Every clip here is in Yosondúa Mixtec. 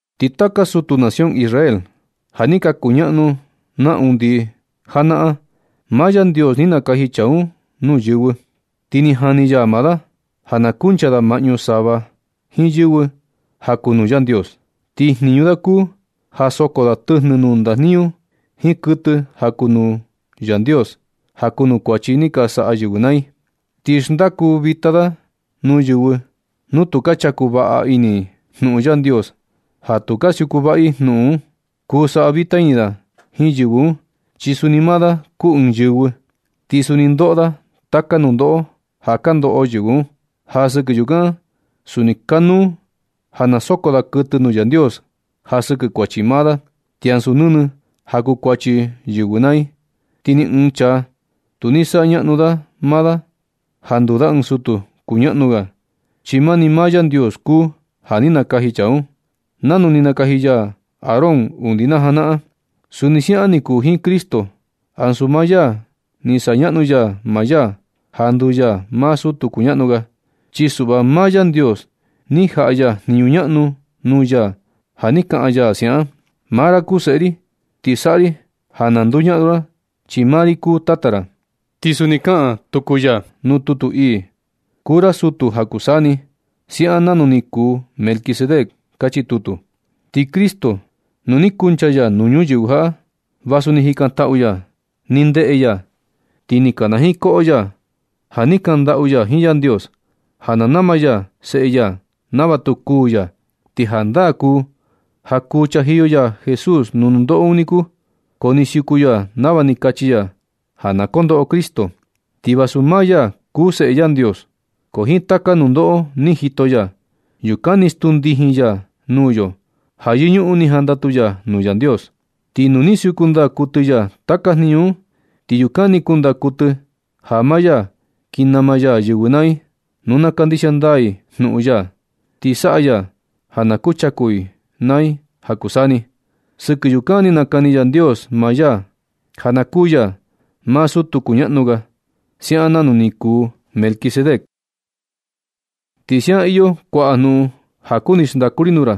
Ti taka sutu nación Israel ja ni ka kuñaꞌnu na undi janaꞌan, maa Yandios ni nakaji chaa un nuu yɨvɨ, ti ni jani ya da ja na kuncha da maꞌñu sava jiin yɨvɨ ja kuu nuu Yandios. Ti jniñu da kuu ja soko da tɨjnɨ nuu ndajniñu jiin kuɨtɨ ja kuu nuu Yandios ja kuu nuu kuachi ni ka saꞌa yɨvɨ naa i. Ti xndaku vita da nuu yɨvɨ nu tu ka chaku vaꞌa ini i jnuꞌun Yandios ja tu ka siuku vaꞌa i jnuꞌun un. Kuu saꞌa vita ini da jiin yɨvɨ un, chi suni maa da kuu ɨɨn yɨvɨ, ti suni ndoꞌo da taka nundoꞌo ja ka ndoꞌo yɨvɨ un. Ja sɨkɨ yukan suni kanuu ja na soko da kuɨtɨ nuu Yandios ja sɨkɨ kuachi maa da, ti ansu nɨnɨ ja kuu kuachi yɨvɨ naa i. Ti ni ɨɨn chaa tu ni kuu sañaꞌnu da maa da ja nduu da ɨɨn sutu kuñaꞌnu ga, chi mani maa Yandios kuu ja ni nakaji chaa un, nanu ni nakaji ya Aarón undi najanaꞌan. Suni siaꞌan ni kuu jiin Cristo, ansu maa ya ni sañaꞌnu ya maa ya ja nduu ya maa sutu kuñaꞌnu ga, chi suꞌva maa Yandios ni jaꞌa ya jniñu ñaꞌnu nuu ya ja ni kaꞌan ya siaꞌan: Maa ra kuu Seꞌe ri. Vijna ti saꞌa ri ja na nduñaꞌnu ra, chi maa ri kuu Tata ra. Ti suni kaꞌan tuku ya nuu tutu ii: Kuu ra sutu ja kuu saa ni, siaꞌan nanu ni kuu Melquisedec. Kachi tutu. Ti Cristo, nu ni kuncha ya nuu ñuyɨvɨ jaꞌa, vasu ni jikantaꞌu ya, ni ndeꞌe ya, ti ni kana jiin koꞌo ya ja ni kaꞌan ndaꞌu ya jiin Yandios, ja na nama ya Seꞌe ya nava tu kuu ya. Ti jandaa kuu ja kuu chajiyo ya Jesús nuu nundoꞌo un niku, ko ni siuku ya nava ni kachi ya ja na kondoꞌo Cristo. Chi vasu maa ya kuu Seꞌe Yandios, ko jiin taka nundoꞌo ni jito ya, yukan ni stuu ndijin ya nuu yo ja yɨñuꞌun ni jandatu ya nuu Yandios. Ti nu ni siuku ndaa kuɨtɨ ya taka jniñu un, ti yukan ni kundaa kuɨtɨ ja maa ya kin nama ya yɨvɨ naa i nu na kandixia ndaa i jnuꞌun ya, ti saꞌa ya ja na kuchaku i naa i ja kuu saa ni. Sɨkɨ yukan ni nakani Yandios maa ya ja na kuu ya maa sutu kuñaꞌnu ga, siaꞌan nanu ni kuu Melquisedec. Ti siaꞌan iyo kuaꞌa jnuꞌun ja kuni xndaku ri nuu ra,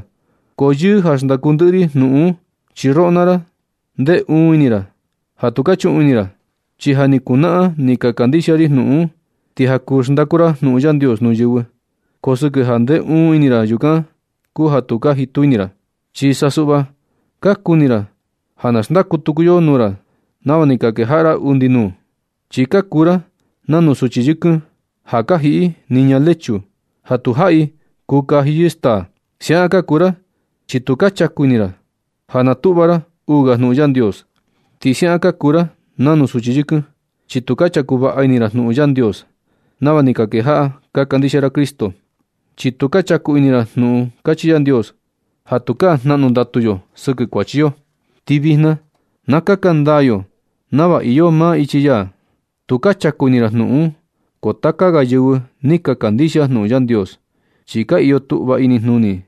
ko yɨɨ ja xndaku ndɨꞌɨ ri jnuꞌun un, chi roꞌo naa ra ndee uun ini ra ja tu ka chuꞌun ini ra. Chi ja ni kunaꞌan ni ka kandixia ri jnuꞌun un, ti ja kuu xndaku ra jnuꞌun Yandios nuu yɨvɨ, ko sɨkɨ ja ndee uun ini ra yukan kuu ja tu ka jitu ini ra, chi sa suꞌva ka kuni ra ja na xndaku tuku yo nuu ra nava ni ka kejaꞌa ra undi nuu. Chi ka kuu ra nanu suchi yɨkɨn ja ka jiꞌi i niña lechu ja tujaꞌi kuu kaji yɨ staa. Siaꞌan ka kuu ra chi tu ka chaku ini ra ja na kutuꞌva ra uu ga jnuꞌun Yandios. Ti siaꞌan ka kuu ra nanu suchi yɨkɨn, chi tu ka chaku vaꞌa ini ra jnuꞌun Yandios nava ni ka kejaꞌa ka kandixia ra Cristo. Chi tu ka chaku ini ra jnuꞌun kachi Yandios ja tukaa jnaꞌnu ndatu yo sɨkɨ kuachi yo, ti vijna na kaka ndaa yo nava iyo maa ichi ya. Tu ka chaku ini ra jnuꞌun un. Ko taka ga yɨvɨ ni ka kandixia jnuꞌun Yandios, chi ka iyo tuꞌva inijnuni i,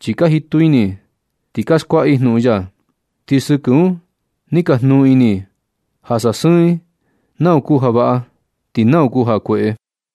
chi ka jitu ini i ti ka skuaꞌa i jnuꞌun ya. Ti sɨkɨ un ni ka jnuu ini i ja sasɨɨn i nau kuu ja vaꞌa ti nau kuu ja kueꞌe.